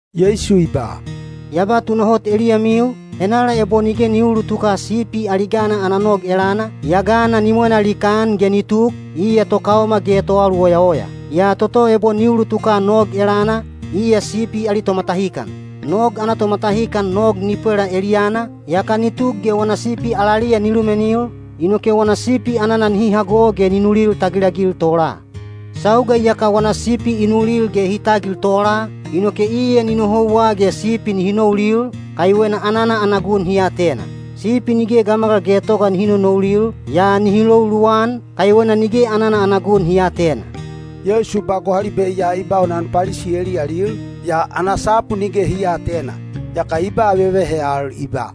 Yeisu i ba, “Ya ba tunahot eliyamiu, henala ebo nige ni uulutuka sipi ali gana ana nog elana, yaa gana ni mwena likaan ge ni tuk, iya tokaoma ge toaluoyaoya. Yaa toto ebo ni ulutuka nog elana, iya sipi ali tomatahikan. Nog ana tomatahikan nog ni pwela eliyana, yaka ni tuk ge wana sipi alaliya ni lumenil, inoke wana sipi anana nihi hago ge ni nulil tagilagil tola. Sauga iyaka wana sipi i nulil ge hi tagil tola, inoke iya ni nohouwa ge sipi nihi noulil, kaiwena anana ana gun hi atena. Sipi nige gamagal getoga nihi nonoulil, yaa nihi lou luwan, kaiwena nige anana ana gun hi aatena.” Yeisu ba gohalibe ya i baunan Palisi eliyalil, yaa ana sapu nige hi aatena. Yaka i ba vevehe al i ba,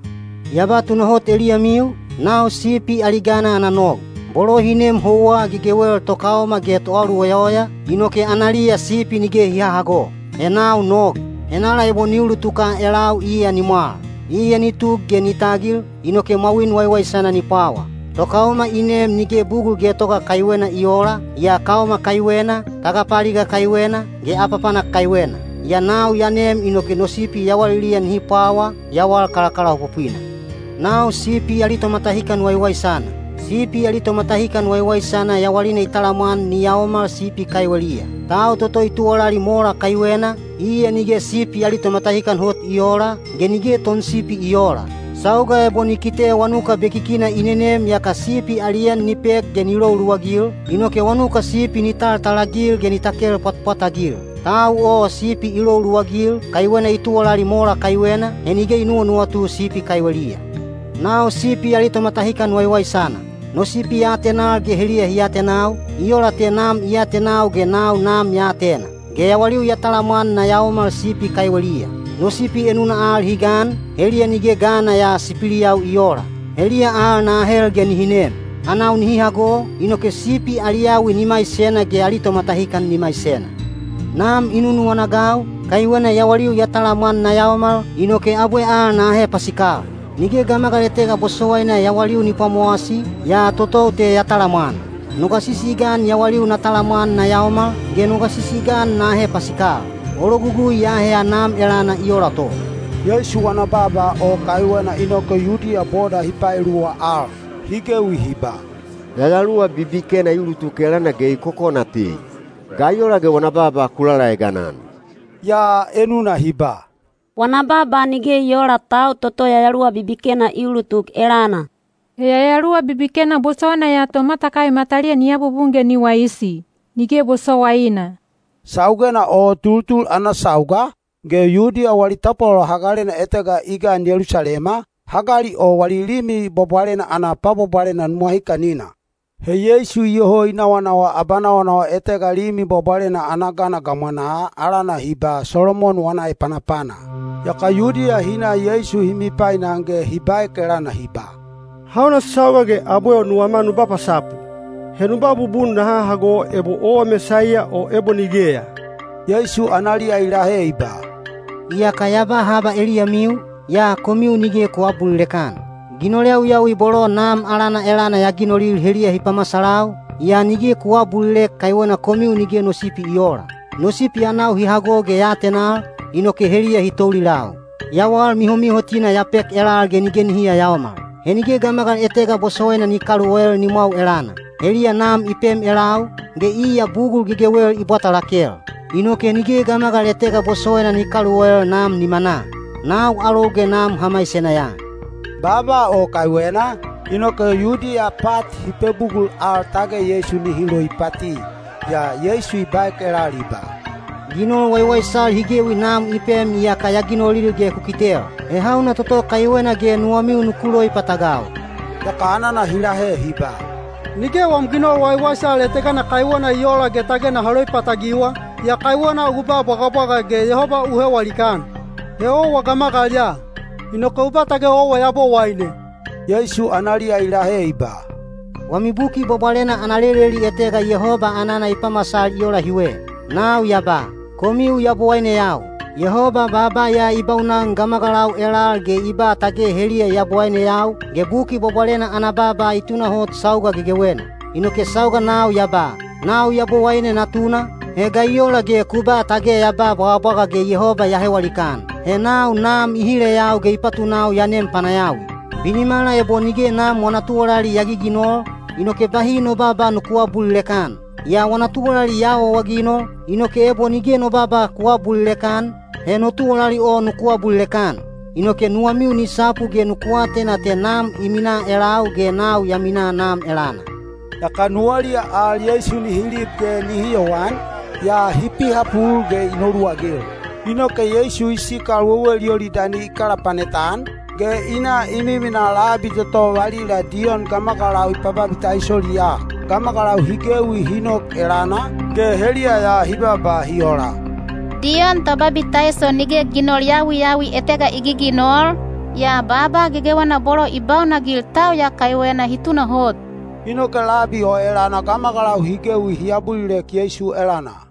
“Ya ba tunahot eliyamiu, nau sipi ali gana ana nog. Bolo hi nem houwa gegewel tokaoma ge toaluoyaoya, inoke analiya sipi nige hi hahago. He nau nog; henala ebo ni ulutuka elau iya ni mwal. Iya ni tuk ge ni tagil, inoke mwawin waiwaisana ni pwawa. Tokaoma i nem nige bugul getoga kaiwena i oola, yaa kaoma kaiwena, tagapaaliga kaiwena, ge apapanak kaiwena. Yaa nau ya nem inoke no sipi yawaliliya nihi pwawa, yawal kalakalaopopwina. “Nau sipi ali tomatahikan waiwaisana. Sipi ali tomatahikan waiwaisana yawalina i talamwan ni yaomal sipi kaiweliya. Tau toto i tuwalali mola kaiwena, iya nige sipi ali tomatahikan hot i oola, ge nige tonsipi i oola. Sauga ebo ni kite wanuka bekikina i nenem yaka sipi ali en ni pek ge ni lou luwagil, inoke wanuka sipi ni taltalagil ge ni takel pwatpwatagil. Tau o sipi i lou luwagil, kaiwena i tuwalali mola kaiwena, he nige i nuwanuwatu sipi kaiweliya. “Nau sipi ali tomatahikan waiwaisana. No sipi ya atenal ge heliya hi atenau, i ola te Nam i atenau ge nau Nam ya atena. Ge yawaliu ya talamwan na yaomal sipi kaiweliya. No sipi enuna al hi gan, heliya nige gana ya sipiliyau i oola. Heliya al na ahel ge nihi nem. Anau nihi hago, inoke sipi ali yawi ni maisena ge ali tomatahikan ni maisena. Nam i nunuwana-agau, kaiwena yawaliu ya talamwan na yaomal—inoke abwe al na ahe pasikal. Nige gamagal etega bosowaina yawaliu ni pwamowasi, yaa totou te ya talamwan. No gasisi i gan yawaliu na talamwan na yaomal, ge no gasisi i gan na ahe pasikal. O logugui ya aheya Nam elana i ola to.” Yeisu wana baaba o kaiwena inoke Yudiya boda hi paeluwa al. Hi gewi hi ba, “Yayaluwa bibikena i ulutuk elana ge i kokona tei. Ga i ola ge wana baaba ku lalaegan-an?” Yaa enuna hi ba, “Wana baaba nige i oola tau toto yayaluwa bibikena i ulutuk elana. He yayaluwa bibikena bosowaina ya tomatakai mataliya ni abubun ge ni waisi? Nige bosowaina!” Saugena o tultul ana sauga, ge Yudiya wali tapwalolo hagalena etega i gan Yelusalema, hagali o wali Limi Bwabwalena ana pwabwabwalena nuwahikanina. He Yeisu iyoho i nawanawa abanawanawa etega Limi Bwabwalena ana gana gamwanaa alana hi ba “Solomon wana Epanapana.” Yaka Yudiya hi na Yeisu hi mipainan ge hi baek elana hi ba, “Hauna sauga ge abwe nuwama nu ba pasapu? He nu ba bubun naha hago ebo owa Mesaiya o ebo nigeya?” Yeisu analiya i lahe i ba, “Iyaka ya ba haba eliyamiu, yaa komiu nige ku aabulilek-an. Ginol yawiyawi bolo Nam alana elana ya ginolil heliya hi pamasalau, yaa nige ku aabulilek kaiwena komiu nige no sipi i oola. No sipi anau hi hago ge ya atenal, inoke heliya hi toulilau. Yawal mihomihotina ya pek elal ge nige nihi yayaomal. He nige gamagal etega bosowaina ni kaluoel nimwau elana. Heliya Nam i pem elau, ge iya bugul gegewel i bwata lakel. Inoke nige gamagal etega bosowaina ni kaluoel Nam nimanaa. Nau alou ge Nam ha maisena ya.” Baaba o kaiwena, inoke Yudiya pat hi pebugul al tage Yeisu nihi loipati. Yaa Yeisu i baek elal i ba, “Ginol waiwaisal hi gewi Nam i pem iyaka ya ginolil ge ku kitel. He hauna toto kaiwena ge nuwamiu nuku loipatagau?” Yaka anana hi lahe hi ba, “Nige wam ginol waiwaisal etegana kaiwena i oola ge tage naha loipatagiwa, yaa kaiwena u ba bwagabwaga ge Yehoba u hewa likaan. He owa gamagal ya, inoke u ba tage owa Yabowaine!” Yeisu analiya i lahe i ba, “Wami Buki Bwabwalena ana leleli etega Yehoba anana i pamasal i ola hiwe: Nau ya ba, ‘Komiu yabowaineyau.’ Yehoba baaba ya i baunan gamagalau elal ge i ba tage heliya yabowaineyau, ge Buki Bwabwalena ana baaba i tunahot sauga gegewena. Inoke sauga nau ya ba, ‘Nau Yabowaine Natuna,’ he ga i ola ge ku ba tage ya ba bwagabwaga ge Yehoba ya hewa likaan? He nau Nam i hileyau ge i patunau ya nem panayawi. “Binimala ebo nige Nam wana tuwalali ya giginol, inoke bahi no baaba nuku aabulilek-an. Yaa wana tuwalali ya awaawaginol, inoke ebo nige no baaba ku aabulilek-an, he no tuwalali o nuku abulilek-an. Inoke nuwamiu ni sapu ge nuku atena te Nam i minaa elau ge nau ya minaa Nam elana.” Yaka nuwaliya al Yeisu nihi lib ge nihi yowan, yaa hi pihapul ge i noluwagil. Inoke Yeisu i sikal wewel Yolidani i kalapanet-an, ge i na i miminaa labi toto valila Diyon gamagalau i pababitaisoliya. Gamagalau hi gewi hi nok elana, ge heliya ya hi baaba hi ola, “Diyon Tobabitaiso nige ginol yawiyawi etega i giginol, yaa baaba gegewena bolo i baunanagil tau ya kaiwena hi tunahot.” Inoke labi o elana gamagalau hi gewi hi abulilek Yeisu elana.